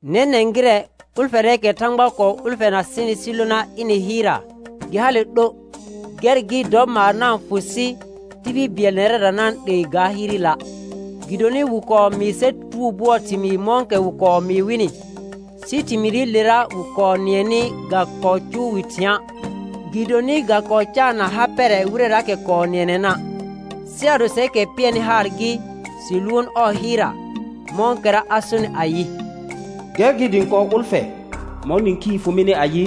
Nɛnɛ̃ gɩrɛ, ʋlfɛrɛɛkɛ Thãgba kɔɔ ʋlfɛna sɩnɩ sɩ lona ɩnɩ hɩɩrra, gɩ hale 'lo, gɛr gɩ dɔ maar na-n fʋ sɩ tibil bɩɛl nɛrɛra na-n 'lee ga hɩɩrɩla'. Gɩdonɩ wɩ kɔɔ mɩɩ sɛr tutugo bʋɔɔ thɩmɩɩ mɔ̃kɛ wɩ kɔɔ mɩɩ wɩnɩ, sɩ thɩmɩɩrɩlera wɩ kɔɔ nɩɛnɩ ga kɔɔ cʋʋ wɩ thɩ̃a', gɩdonɩ ga kɔɔ caanna ha pɛrɛ wɩrɛraakɛ kɔɔ nɩɛnɛna'. Sɩ ado sɛrkɛ pɩɛrnɩ haar gɩ, sɩ lʋʋn ɔɔ hɩɩrra, mɔ̃kɛra a sonɩ ayɩ: «Gɛr gɩ dɩ ɩ̃ kɔɔ ʋlfɛ mɔ̃ nĩkhii fʋ mɩnɩ ayɩ: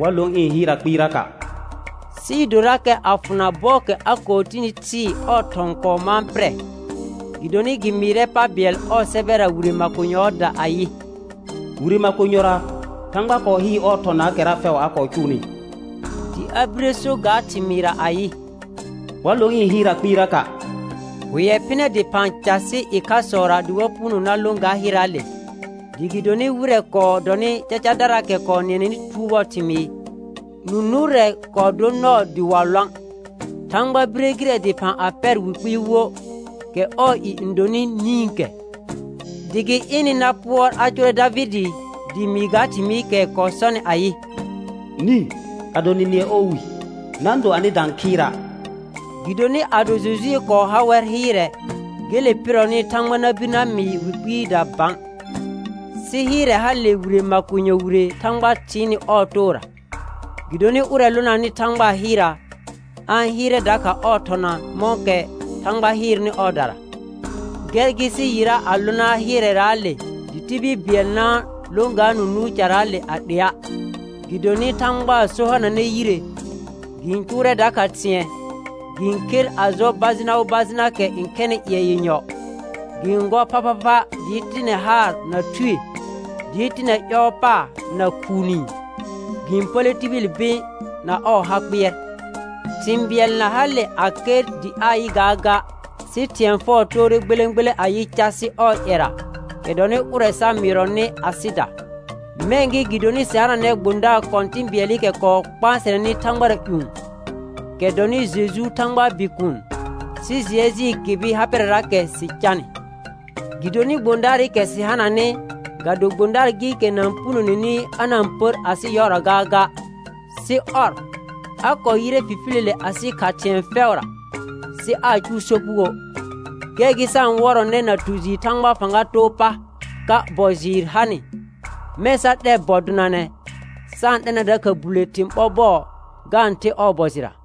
Wa lõ ɩ̃ hɩɩrra kpɩɩraka'.» Sɩɩ dorakɛ a fʋna bɔɔkɛ a kɔɔ tini thɩɩ ɔɔ thɔ̃ kɔɔ mãa pɩrɛ. Gɩdonɩ gɩ mɩɩrɛ pa bɩɛl ɔɔ sɛbɛra wire makonyɔɔda ayɩ: «Wire makonyɔra Thãgba kɔɔ hɩɩr ɔɔ thɔnaakɛra fɛʋ a kɔɔ cʋʋnɩ.» Dɩ a bire so ga thɩmɩɩra ayɩ: «Wa lõ ɩ̃ hɩɩrra kpɩɩraka'.» Hʋɛ phɩnɛ dɩphã casɩ ɩkhasɔra dɩ wa puno na lõ ga hɩɩrraale, dɩ gɩdonɩ wɩrɛ kɔɔ dɔnɩ cacadaraakɛ kɔɔ nɩɛnɛnɩ tutugo bʋɔɔ thɩmɩɩ, nũ nʋʋrɛ kɔɔ dor nɔɔ dɩ wa lõa', Thãgba bire gɩrɛ dɩphã a pɛr wi kpɩɩ wo, kɛ ɔɔ i n donɩ «Nĩkɛ», dɩ gɩ ɩnɩ na pʋɔr a cʋʋrɛ Davɩdɩ dɩ mɩɩ ga thɩmɩɩkɛ kɔɔ sɔnɩ ayɩ: «Nĩ, ado nɩ nɩɛ ɔɔ wi, na-n do anɩda n khɩɩra'.» Gɩdonɩ ado Jojue kɔɔ ha wɛr hɩɩrɛ, gele pɩrɔnɩ Thãgba na bir na mɩɩ wi kpɩɩda bã. Sɩ hɩɩrɛ hale wire makonyɔ wire Thãgba thɩɩnnɩ ɔɔ toora. Gɩdonɩ ʋrɛ lonanɩ Thãgbaa hɩɩrra, a-n hɩɩrɛ dakha ɔɔ thɔna mɔ̃kɛ Thãgba hɩɩrnɩ ɔɔdara. Gɛr gɩ sɩ yɩra a lona hɩɩrɛraale, dɩ tibil bɩɛl na-n lõ ga nũ nʋʋr caraale a 'lea'. Gɩdonɩ Thãgbaa so hananɛ yire, gɩ-n cʋʋrɛ dakha thɩ̃ɛ, gɩ-n kher a jɔ bajɩna wo bajɩnaakɛ n khɛnɩ ƴɩɛ yenyɔ, gɩ-n gɔr phaphapha dɩɩ tɩnɛ haar na thue, dɩɩ tɩnɛ ƴɔɔ pa na khuu niin, gɩ-n pəlle tibili bɩ̃ na ɔɔ ha kpɩɛr. Thɩ̃ bɩɛl na hale a ker dɩ aa yɩ gaaga, sɩ thɩ̃ɛ fɛʋ toore gbelẽ gbelẽ a yɩr casɩ ɔɔ ƴɛra, kɛ dɔnɩ ʋrɛ sa mɩɩrɔnɩ asɩda. Mɛ̃ gɩ gɩdonɩ sɩ hananɛ gbõdaar kɔ̃tɩ̃ bɩɛlɩkɛ kɔɔ kpãsɛnɛnɩ thãgbara ƴũ, kɛ dɔnɩ Jeju Thãgbaa Bikuun, sɩ jɩɛ jɩɩl kɩbɩ ha pɛrɛraakɛ sɩ canɩ. Gɩdonɩ gbõdaarɩkɛ sɩ hananɩ, ga do gbõdaar gɩɩkɛ na-n punoneni a na-n pər asɩ yɔɔra gaaga, sɩ ɔr, a kɔɔ yɩrɛ fifiləle asɩ kha thɩ̃ɛ fɛʋra, sɩ aa cʋʋ sopugoə'. Gɛr gɩ sa-n wɔrɔnɛ na tu jɩɩr Thãgbaa fãga too pa, ka bɔ jɩɩr hanɩ, mɛ̃ sa 'lɛ bɔ donanɛ, sa-n 'lɛna dakha bulle thɩ̃ ɓɔr bɔɔ ga-n the ɔɔ bɔ jɩra.